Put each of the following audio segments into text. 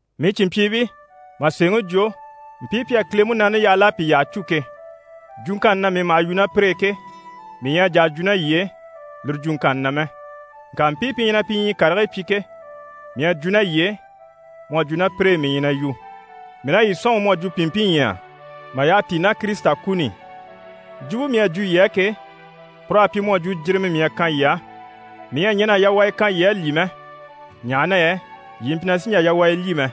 Mii cìnmpyiibii, mà sèeŋi jwo, mpii pi à Kile Munaani yaha l'à pi yyaha cû ke, jwuŋkanni na mii maha yu ná pire e ke, mii ɲyɛ a jà a jwo ná yii e lire jwuŋkanni na mɛ. Ŋka mpii pi ɲyɛ na pi ɲyii karigii kanni pyi ke, mii à jwo ná yii e mu à jwo ná pire e mii ɲyɛ na yu. Mii na yii sɔ̂nŋi mu à jwo pìnmpinɲyɛya mà yyaha tíi ná Kirisita kuni i. Jwumpe mii à jwo yii á ke, pur'à pyi mu à jwo jirimɛ mii à kan yii á. Mii ɲyɛ a ɲɛn'a yawaya kan yii a lyî mɛ, ɲaha na yɛ yii mpyi na sì n‑jà yawaya lyî mɛ.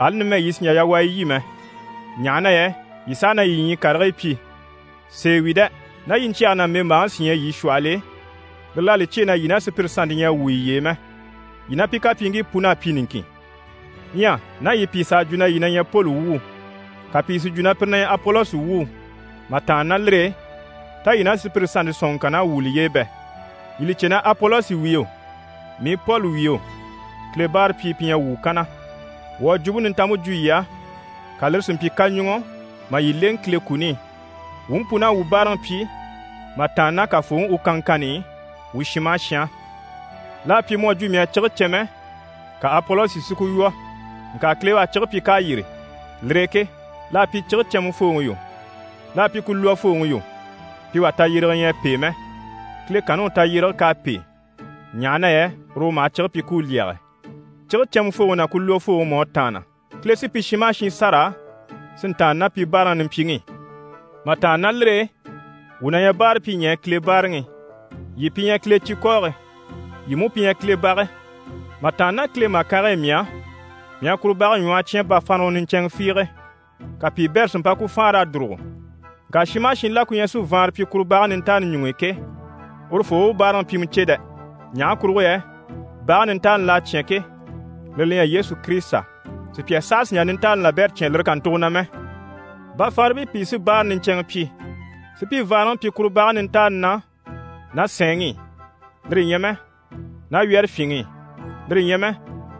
Ali numɛ yii sì n‑jà yawaya lyî mɛ, ɲaha na yɛ yii saha na yii ɲyii karigii pyi. Sèe wi dɛ! Ná yiɲcyɛge ná mbèmbaaŋi sí ɲyɛ yii shwɔhɔl'e, lire l'à li cyêe na yii ná sùpyire sannte ɲyɛ a wwû yiye e mɛ. Yii ná pi kapyiiŋkii pun'à pyi niŋkin. Ɲyɛ ná yii pìi s'à jwo na yii na ɲyɛ Poli wuu, ka pìi si jwo na pire na ɲyɛ Apolosi wuu, mà tàanna ná lire e, tá yii ná sùpyire sannte sɔ̀nŋɔŋkann'à wwû liye e bɛ? Yii li cè na Apolosi wi yo, mii Poli wi yo, Kile báarapyii pi ɲyɛ wuu kanna. Wuu à Jwumpe Nintanmpe jwo yii á, ka lire si mpyi kaɲuŋɔ mà yii lèŋɛ Kile kuni i, wuu mú pun'à wuu báaraŋi pyi mà tàanna ná Kafooŋi u kanŋkanni i wuu shin maha shin á. L'à pyi mu à jwo mii à cige cɛnmɛ, ka Apolosi si ku lwɔ̀, ŋka Kile u à cige pyi k'à yîri. Lire e ke l'à pyi cige cɛnmɛfooŋi yo, l'à pyi ku lwɔfooŋi yo, pi wà tayyérege ɲyɛ a pêe mɛ. Kile kanni u tayyérege k'à pêe, ɲaha na yɛ uru u maha cige pyi ku u lyɛge. Cige cɛnmɛfooŋi ná ku lwɔfooŋi mú à tàanna. Kile sí pi shin maha shin sâra si ntàanna ná pi báaraŋi nimpyiŋi i. Mà tàanna ná lire e, wuu na ɲyɛ báarapyiɲɛɛ Kile báaraŋi i, yii pi ɲyɛ Kile cikɔɔge. Yii mú pi ɲyɛ Kile bage. Mà tàanna ná Kile màkange e mii á, mii à kuru bage ɲwɔhɔ cyán bafaanrawa niɲcɛnŋɛ fiige, ka piibɛrɛ si mpa ku faanra a dùrugo. Ŋka shin maha shin la ku ɲyɛ si vaanra pyi kuru bage nintaani ɲuŋ'i ke, urufoo u u báaraŋi pyimɛ cè dɛ! Ɲaha kurugo yɛ bage nintaani l'à cyán ke, lire li ɲyɛ Yesu Kirisita. Sùpya saha sì n‑jà nintaani labɛrɛ cyán lire kàntugo na mɛ. Bafaanribii pìi sí báara niɲcɛnŋɛ pyi, si pi vaanraŋi pyi kuru bage nintaani na ná sɛɛnŋi i, lire ɲyɛ mɛ ná wyɛ́rɛfyinŋi i, lire ɲyɛ mɛ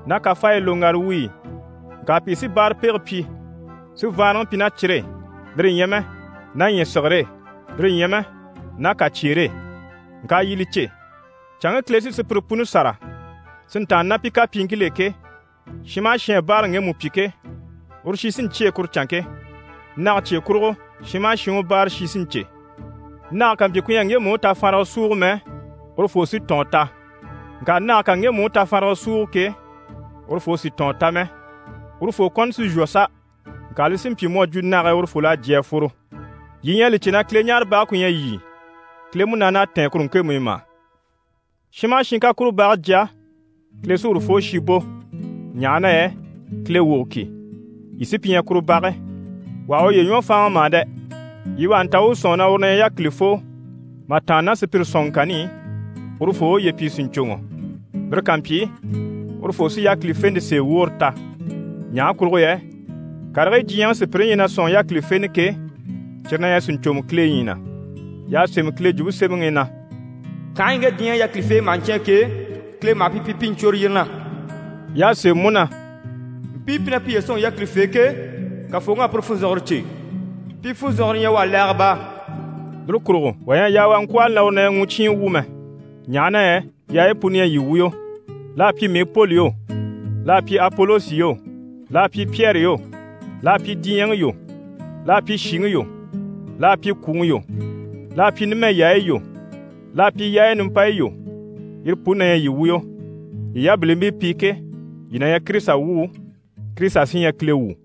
ná kafaayi loŋgara wuyi i. Ŋka pìi sí báarapege pyi si vaanraŋi pyi ná cire e, lire ɲyɛ mɛ ná ɲyɛ̀sigire e, lire ɲyɛ mɛ ná kàcyeere e. Ŋka yii li cè, canŋke Kile sí sùpyire puni sâra si ntàanna ná pi kapyiiŋkil'e ke, shin maha shin à báaraŋi ŋgemu pyi ke, uru shi sí n‑cyêe kuru canŋke. Nage cye kurugo shin maha shin u báara shi sí n‑cè. Nage ká mpyi ku ɲyɛ a ŋgemu u tafaanraga súugo mɛ, urufoo sí tɔ̀ɔn ta. Ŋka nage ká ŋgemu u tafaanraga súugo ke, urufoo sì tɔ̀ɔn ta mɛ. Urufoo kɔni sí n‑shwɔ sa! Ŋka li sí n‑pyi mu à jwo nage e urufol'à jyè a fworo. Yii ɲyɛ a li cè na Kileɲaarebage ku ɲyɛ yii, Kile Munaani à tɛ̀ɛn kuru ŋkemu i mà? Shin maha shin ká kuru bage jya, Kile sí urufoo shi bò, ɲaha na yɛ Kile wogo ki, yii sí pi ɲyɛ kuru bage. Wà ha uye ɲwɔ fáanŋa mà dɛ! Yii wà ha nta u u sɔ̂nŋi na uru na ɲyɛ yákilifoo mà tàanna ná sùpyire sɔ̀nŋɔŋkanni i, urufoo u uye pyi sìɲcoŋɔ. Lire ká mpyi, urufoo sí yákilifente sèe woore ta. Ɲaha kurugo yɛ karigii diɲyɛŋi sùpyire ɲyɛ na sɔ̂nŋi yákilifenɛ ke, cyire na ɲyɛ sìɲcomɔ Kile ɲyii na. Y'à sémɛ Kile Jwumpe Semɛŋi i na: «Kànhaɲyi ŋge diɲyɛŋi yákilifeebii maha ɲcyáan ke, Kile maha pi pyi pi i ɲcwôre yire na.» Y'à sémɛ mú na: «Mpii pi ɲyɛ na piye sɔ̂nŋi yákilifee ke, Kafooŋi à pire funzɔnŋɔre cè. Pi funzɔnŋɔre ɲyɛ u á laaga baa.» Lire kurugo wà ɲyɛ a yaa u a ŋkwɔ̂hɔli na uru na ɲyɛ mucyiin wu mɛ, ɲaha na yɛ yaayi puni ɲyɛ yii wuyo. L'à pyi mii Poli yo, l'à pyi Apolosi yo, l'à pyi Pyɛri yo, l'à pyi diɲyɛŋi yo, l'à pyi shìŋi yo, l'à pyi kwùŋi yo, l'à pyi numɛ yaayi yo, l'à pyi yaayi nimpayi yo, yire puni na ɲyɛ yii wuyo. Yii yabilimpii pi ke, yii na ɲyɛ Kirisita wuu, Kirisita sí ɲyɛ Kile wu.